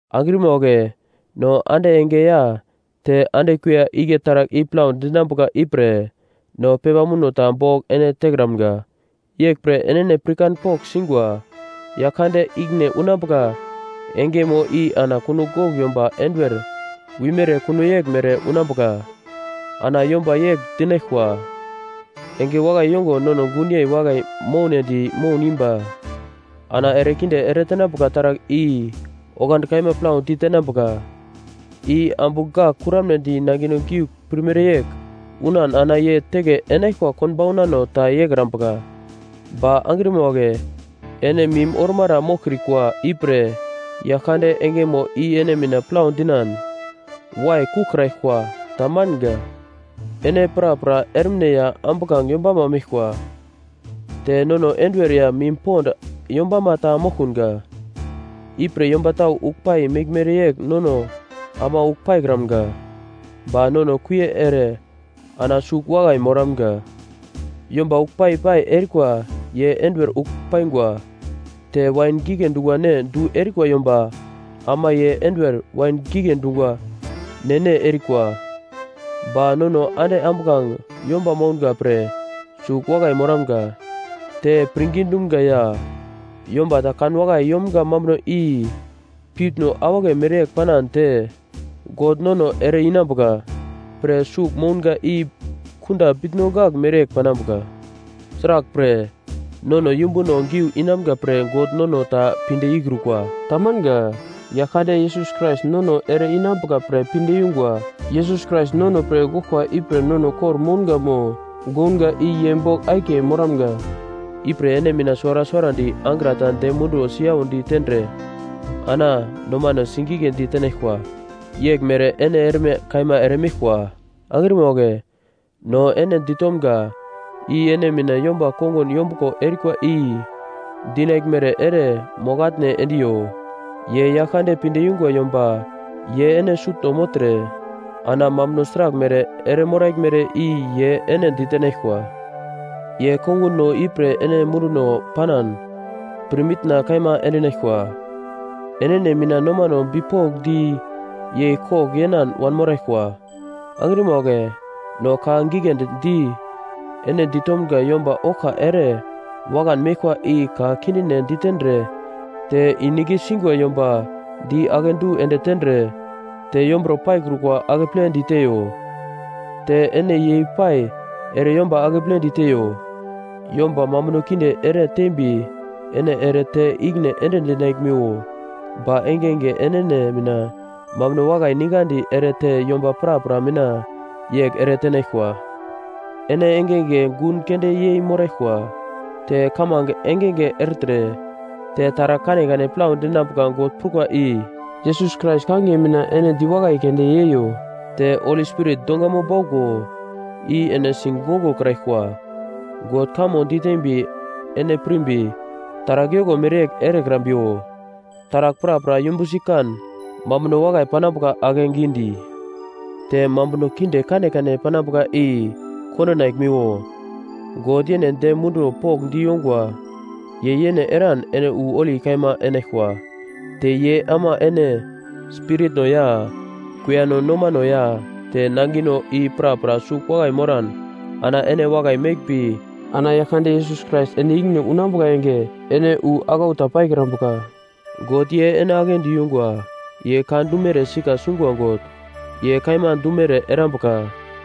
Angrima wagle no ande enge ya te ande kuiya igle taragl i plau dinambuka ipre no pepa muno ta bogl ene tekramga. Yeglpre enene pirkan pogl singwa Yaglkande ikine unambuka engemo i ana kunogl gogl yomba enduwer wimere kuno yeglmere unambuka. Ana yomba yegl dinaglkwa, “Enge wakai yongo nono gunyei wakai mounedi moun imba.” Ana erekinde eretenambuka taragl i oglandi kaima plau ditenambuka, i ambu gak kuramnedi nangino giugl pirmere yegl unan ana ye teke enaglkwa konbaunano ta yeikrambuka. Ba angrima wagle ene mim ormara moglkrikwa ipre yaglkande engemo i ene mina plau dinan waikuglkraglkwa tamanga. Ene prapra ermine ya ambuglange yombama meglkwa. Te nono enduwer ya mim pond yombama ta moglkunga. Ipre yomba tau ugl pai meglmere yegl nono ama ugl paikramga. Ba nono kuie ere ana sugl wakai moramga. Yomba ugl pai-pai erikwa ye enduwer ugl paingwa. Te wain gigle dungwa ne du erikwa yomba ama ye enduwer wain gigle dungwa ne-ne erikwa. Ba nono ande ambuglange yomba mounga pre sugl wakai moramga. Te pirngi dumga ya yomba ta kan wakai yomga mambuno i piutno awagle mereyegl panan te God nono ere-inambuka pre sugl mounga i kunda bitno gagl mereyegl panambuka. Sraglpre nono yumbuno giu inamga pre God nono ta pinde ikrukwa. Tamanga. Yaglkande Yesus Krais nono ere-inambuka pre pinde yungwa. Yesus Krais nono pre goglkwa ipre nono kor-mounga mo gounga i ye bogl akiye moramga. Ipre ene mina suwara suwarandi angra ta dem munduwo siyaudi tendre ana nomano sigigledi tenaglkwa. Yeglmere ene erme kaima ere meglkwa. Angrima wagle, no ene ditomga i ene mina yomba kongun yombuglo erikwa i dinaglmere ere mogl-atne endiyo. Ye Yaglkande pinde yungwa yomba ye ene sutno mogltre, ana mambuno sraglmere eremoraglmere i ye ene ditenaglkwa. Ye konguno ipre ene munduno panan pirmitna kaima endinaglkwa. Enene mina nomano bipokndi yei kogl yenan wanmoraglkwa. Angrima wagle, no ka giglendi ene ditomga yomba oglka ere wakan meglkwa i ka kindine ditendre te inik singwa yomba di akedu ende tendre te yomburo paikrukwa akeple diteiyo. Te ene yei-pai ere yomba akeple diteyo. Yomba mambuno kinde ere tembi ene ere te ikine ende dinaglmiwo. Ba engenge enene mina mambuno wakai ningadi ere te yomba prapra mina yegl ere tenaglkwa. Ene engenge gun keunde yei moraglkwa. Te kamange engenge ertre. Te taragl kanekane plau dinambuka God prukwa i Yesus Krais kangiye mina ene diwakai keunde yeiyo. Te Holi Spirit dongamo bauglo i ene sigongokraglkwa. God kamo ditembi ene pirmbi taragl yoko mereyegl erekrambiwo. Taragl prapra yumbusi kan, mambuno wakai panambuka akegidi. Te mambuno kinde kanekane panambuka i kondinaglmiwo. God yene dem munduwo pokndi yongwa. Ye yene eran ene wu holi kaima enaglkwa. Te ye ama ene spiritno ya kuiyano nomano ya te nangino i prapra sugl wakai moran ana ene wakai meglmbi ana Yaglkande Yesus Krais ende ikine unambuka enge, ene wu aglau ta paikrambuka. God ye ene aglendi yungwa, ye ka dumere sika sungwa God, ye kaima dumere erambuka.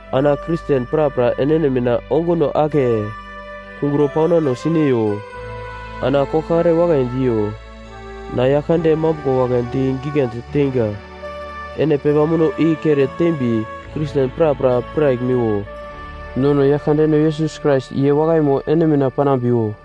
Ana Kristen prapra enene mina onguno ake kungro paunano sineyo ana koglkare wakai diyo. Na Yaglkande mambuglo wagle di giglendi teinga. Ene pepa muno i kere tembi Kristen prapra piraglmiwo. Nono Yaglkandeno Yesus Krais ye wakaimo ene mina panambiwo.